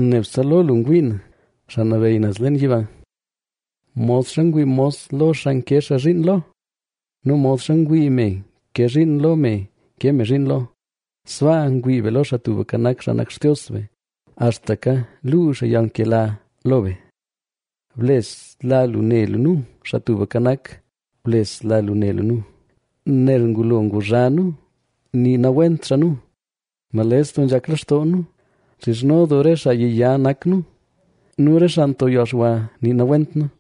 Nebse lo lu ngwii na, xaa nabeyy naz leen yiba. Modxa ngwii mos lo xaa nke xaa zhiin lo nu modxa ngwii me nke zhiin lo me nke me zhiin lo, sbaa ngwii be lo Xaa Tubka Nak, xaa nak Xtios be, axtaka luu xaa yalnkela lo be. Blesla lu ne lu nu, Xaa Tubka Nak, blesla lu ne lu nu, nel ngulo nguzha nu nii nawent xaa nu. Nales doo nzhak lextoo nu, nxizhno doo re xaa yiya nak nu nu re xaa nto yalxwa nii nawent nu.